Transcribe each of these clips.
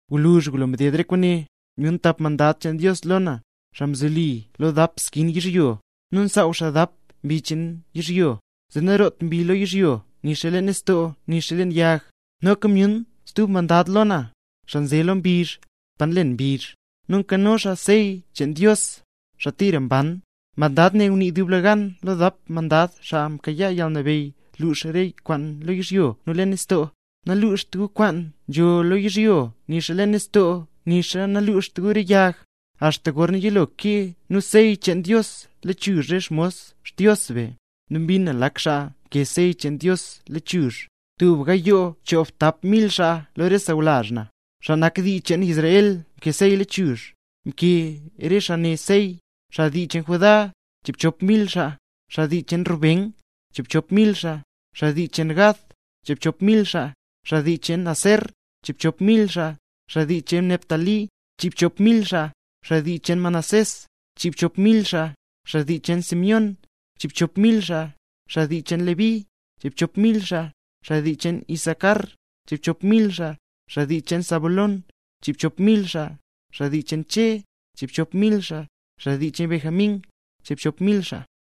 Gwluzh ngulo mded re kwaane, myun tap mandad cheen Dios lo na, xaa nzoli lo dap skin yizhyo, nu nsaaw xaa dap mbi cheen yizhyo, zee nanroot mbi lo yizhyo nixa leen nistoo nixa leen yag. Noka myun stub mandad lo na, xaa nze lo mbizh, pa nlen mbizh; nu nkano xaa sey cheen Dios, xaa tira mban. Mandad ne ngunii dublegan lo dap mandad xaa mkayaa yalnabeyy lux re kwaan lo yizhyo nu leen nistoo: —¡Naluxt gu kwaan nzho lo yizhyo nixa leen nistoo nixa naluxt gu re yag, axta gorna yilo kee nu sey cheen Dios lechuzh re xmos Xdios be! Nu mbin na lak xaa mkee sey cheen Dios lechuzh, tub gayoo choobtap mil xaa lo re sawlazh na, xaa nak dii cheen Israel, mkee sey lechuzh. Mkee re xaa ne sey: xaa dii cheen Judá, chiibchop mil xaa, xaa dii cheen Rubén, chiibchop mil xaa, xaa dii cheen Gad, chiibchop mil xaa, xaa dii cheen Aser, chiibchop mil xaa, xaa dii cheen Neftalí, chiibchop mil xaa, xaa dii cheen Manasés, chiibchop mil xaa, xaa dii cheen Simeón, chiibchop mil xaa, xaa dii cheen Leví, chiibchop mil xaa, xaa dii cheen Isacar, chiibchop mil xaa, xaa dii cheen Zabulón, chiibchop mil xaa, xaa dii cheen Che, chiibchop mil xaa, xaa dii cheen Benjamín, chiibchop mil xaa,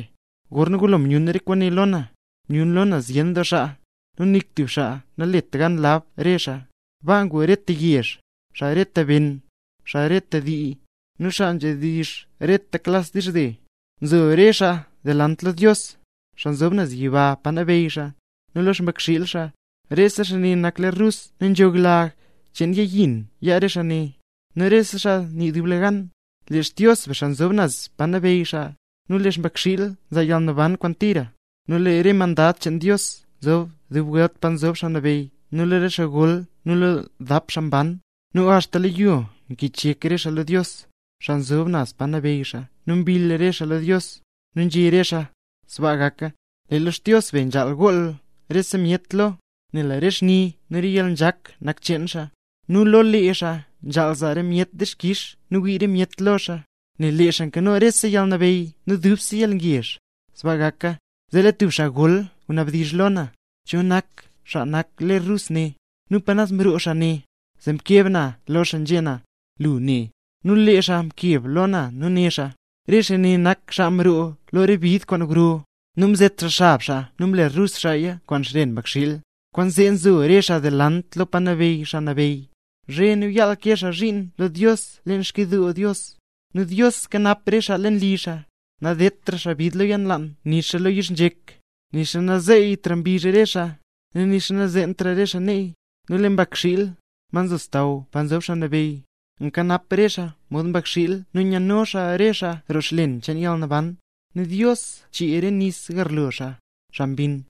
Gorna ngulo myun re kwaane lo na, myun lo na zyen doo xaa, nu nik tub xaa nalet gan lab re xaa. Baa ngu xaa reta yezh, xaa reta ben, xaa reta dii, nu xaa nzhedizh reta klas dizhze. Nzo re xaa delant lo Dios, xaa nzob xaa naz pa nabeyy xaa, nu lo Mbakxiil. Rese xaa ne nak ler rus nu nzho lag cheen yag yin yaa re xaa ne. Nu rese xaa nii dublegan: ¡Lee Xdios be, xaa nzob naz pa nabeyy xaa, nu lee Mbakxiil nzaa yalnaban kwaan tira! Nu lee rese mandad cheen Dios nzo dub welt pa nzob Xaa Nabeyy nu lo re xaa gol nu lo dap xaa mban. Nu axta lo yo mkichyek re xaa lo Dios, xaa nzob naz pa nabeyy xaa nu mbill re xaa lo Dios. Nu nzhé re xaa: ¡Sbaa gaka! Lee lo Xdios be nzhaal gool rese myet lo, nel re xni nu yalnzhak nak cheen xaa, nu lo lee xaa nzhaal zaa rese myet dixkix nu wii rese myet lo xaa, nel lee xaa nkano rese yalnabeyy nu dubse yalngezh. ¡Sbaa gaka! Zee lee tub xaa gol ngunabdizh lo na: —¿Cho nak re xaa nak ler rus ne?, nu ¿pa mroo re xaa ne? Zee mkeb na lo xaa nzhé na: —Lu ne. Nu lee xaa mkeb lo na nu né xaa: —Re xaa ne nak xaa mroo lo re bid kwaan gro, nu mzet xaa xab xaa nu mle rus xaaya kwaan xren Mbakxiil. Kwaanzee nzo re xaa delant lo pa nabeyy Xaa Nabeyy, zhe nu yaal nkee xaa zhiin lo Dios leen Xkyidoo Dios, nu Dios kanap re xaa leen li xaa. Nadedtra xaa bid lo yalnlaan nixa lo yizhnzhek, nixa nazeyytra mbizh re xaa, nu nixa nazeentra re xaa neey; nel lee Mbakxiil, ma nzo xsaww pa nzob Xaa Nabeyy, nkanap re xaa mod mbakxiil nu nyano xaa re xaa roo xlen cheen yalnaban, nu Dios chee re nis garlo xaa, xaa mbinn.